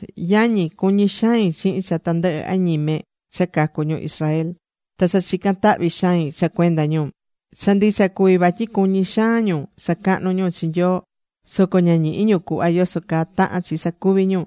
Yañi, cuñí xain chihin cha tandɨhɨ añime cha cacu ñu Israel. Ta cha chica̱n tahvi xain cha cuenda ñu. Cha ndicha cuví vatyi cuñí xaan ñu sacahnú ñu chi Nyoo, soco ña ñihí ñu cuhva yoso caa tahán chi sacuví ñu.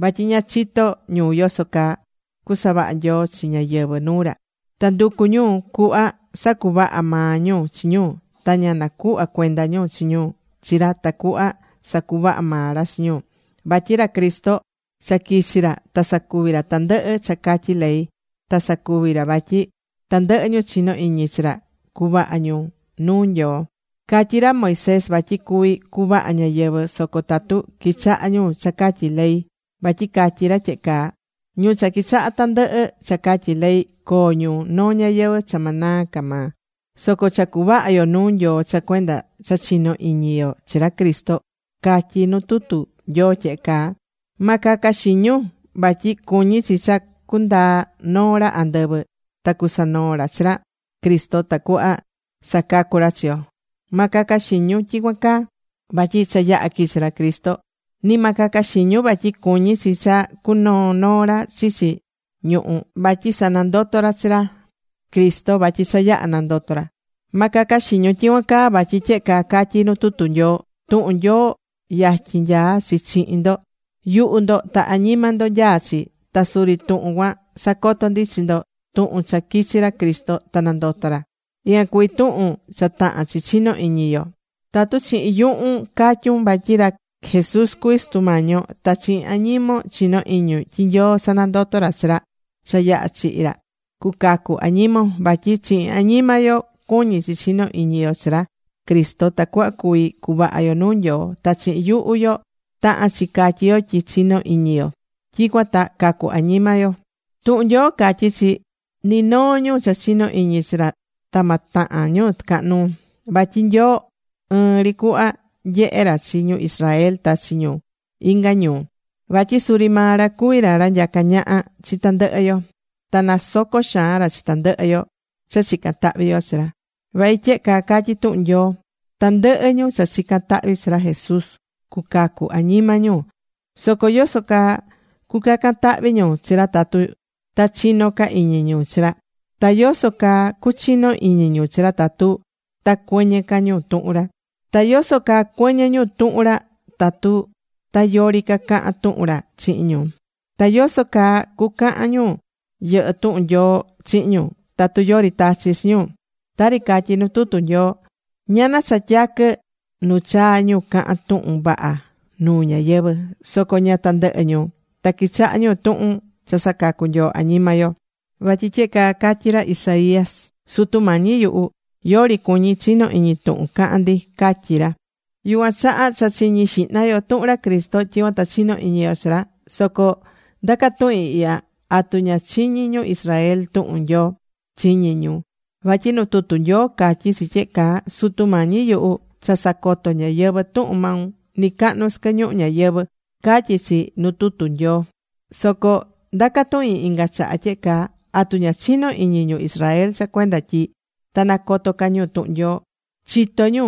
Vatyi ña chitó ñu yoso caa sacuvahá Nyoo chi ñáyɨvɨ nuu ra. Ta nducú ñu cuhva sacuvaha maa ñu chi ñu, ta ña nacuhvá cuenda ñu chi ñu chi ra tacuhva sacuvaha maa ra chi ñu. Vatyi ra Cristo cha quichi̱ ra ta sacuvi̱ ra tandɨhɨ cha catyí ley, ta sacuví ra vatyi tandɨhɨ ñu chinó iñi chi ra, cuvaha ñu nuu Nyoo. Catyí ra Moisés vatyi cuví cuvaha ñáyɨvɨ, soco tatu quichahá ñu cha catyí ley, vatyi catyí ra tyehe caa: “Ñu cha quichahá tandɨhɨ cha catyí ley, coo ñu noo ñayɨvɨ̱ cha ma naa ca maa.” Soco cha cuvaha yo nuu Nyoo cha cuenda cha chinó iñi yo chi ra Cristo, catyí nuu tutu Nyoo tyehe caa: “Ma caca xiñun vatyi cuñí chi cha cundaa noo ra andɨvɨ ta cusanoo ra chi ra Cristo tacuhva sacacu ra chi yo.” Ma caca xiñun tyicuan caa vatyi cha yaha̱ quichi ra Cristo. Ni ma caca xiñun vatyi cuñí chi cha cunoo noo ra chichi ñuhú vatyi sanandoto ra chi ra Cristo, vatyi cha yaha̱ nandoto ra. Ma caca xiñun tyicuan caa vatyi tyehe caa catyí nu tutu Nyoo: “Tuhun Nyoo yatyin nyaá chi chihin ndo, yuhu ndo ta añima ndo nyaá chi.” Ta suri tuhun cuan sacoto ndi chi ndo, tuhun cha quichi̱ ra Cristo ta nandoto̱ ra. Ican cuví tuhun cha tahán chi chinó iñi yo. Tatu chihin yuhun catyún vatyi ra Jesús cuví Sutu Mañi yo, ta chihin añimon chinó iñun tyi Nyoo sanandoto̱ ra chi ra cha yaha̱ chihi̱ ra, cucacu añimon. Vatyi chihin añima yo cuñí chi chino iñi yo chi ra Cristo tacuhva cuvi cuvaha yo nuu Nyoo, ta chihin yuhu yo tahán chi catyí yo tyi chinó iñi yo, tyicuan ta cacu añima yo. Tuhun Nyoo catyí chi: “Ni noo ñu cha chinó iñi chi ra ta ma tahan ñu tɨcahan nuu.” Vatyi Nyoo ɨɨn ri cuhva nyehé ra chi ñu Israel ta chi ñu inga ñuu. Vatyi suri maa ra cuví ra ra nyacá ñaha chi tandɨhɨ yo. Ta nasocó xaan ra chi tandɨhɨ yo cha chicán tahvi yo chi ra. Vatyi tyehe caa catyí tuhun Nyoo: “Tandɨhɨ ñu cha chicán tahvi chi ra Jesús cucacu añima ñu.” Soco ¿yoso caa cucacan tahvi ñu chi ra tatu ta chino ca iñi ñu chi ra? Ta ¿yoso caa cuchino iñi ñu chi ra tatu ta cuɨñɨ ca ñu tuhun ra? Ta ¿yoso caa cuɨñɨ ñu tuhun ra tatu ta yori ca caha̱n tuhun ra chihin ñu? Ta ¿yoso caa cucahan ñu yɨhɨ́ tuhun Nyoo chihin ñu, tatu yori tachi chi ñu? Tari catyí nu tutu Nyoo: “Ñana cha tyaquɨ nu chaa ñu cahán tuhun vaha nuu ñáyɨvɨ.” Soco ña tandɨhɨ ñu ta quichahá ñu tuhun cha sacacú Nyoo añima yo. Vatyi tyehe caa catyi̱ ra Isaías: “Sutu Mañi yuhu, yori cuñí chino iñi tuhun cahán ndi”, catyi̱ ra. Yucuan chaha cha chiñí xihna yo tuhun ra Cristo, tyicuan ta chino iñi yo chi ra. Soco ndacá tuhin ihya: ¿Atu ña chiñi̱ ñu Israel tuhun Nyoo? ¡Chiñi̱ ñu! Vatyi nu tutu Nyoo catyí chi tyehe caa: Sutu Mañi yuhu, cha sacoto̱ ñáyɨvɨ tuhun maun nɨcahnu sɨquɨ ñuhu ñayɨvɨ̱, catyí chi nu tutu Nyoo. Soco ndacá tuhin inga chaha tyehe caa: ¿Atu ña chinó iñi ñu Israel cha cuenda tyi ta nacoto ca ñu tuhun Nyoo? ¡Chitó ñu!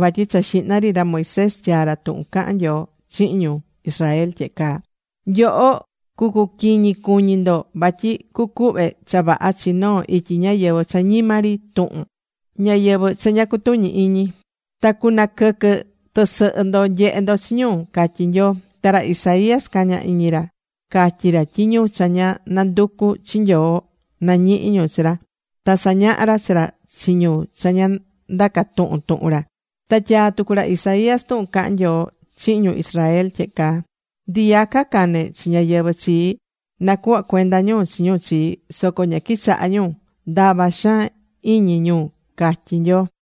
Vatyi cha xihna ri ra Moisés tyaa̱ ra tuhun cahán Nyoo chihin ñu Israel tyehe caa: Nyoho, cucuquiñi cuñi ndo vatyi cucuhve cha vaha chi noo ityi ñáyɨvɨ cha ñima ri tuhun, ñáyɨvɨ cha ña cutuñí iñi. Ta cunaquɨquɨ tɨsɨhɨ ndo nyehé ndo chi ñu, catyí Nyoo. Ta ra Isaías caña̱ iñi ra catyi ra tyi ñu cha ña nanducu̱ chi Nyoo, nañihi̱ ñu chi ra. Ta sañahá ra chi ra chi ñu cha ña ndaca̱ tuhun tuhun ra. Ta tyaa̱ tucu ra Isaías tuhun cahán Nyoo chihin ñu Israel tyehe caa: “Ndiyaca cane̱ chi ñáyɨvɨ chii, nacuhva cuenda ñu chi ñu chii, soco ña quichahá ñu. Ndava xaan iñi ñu”, catyí Nyoo.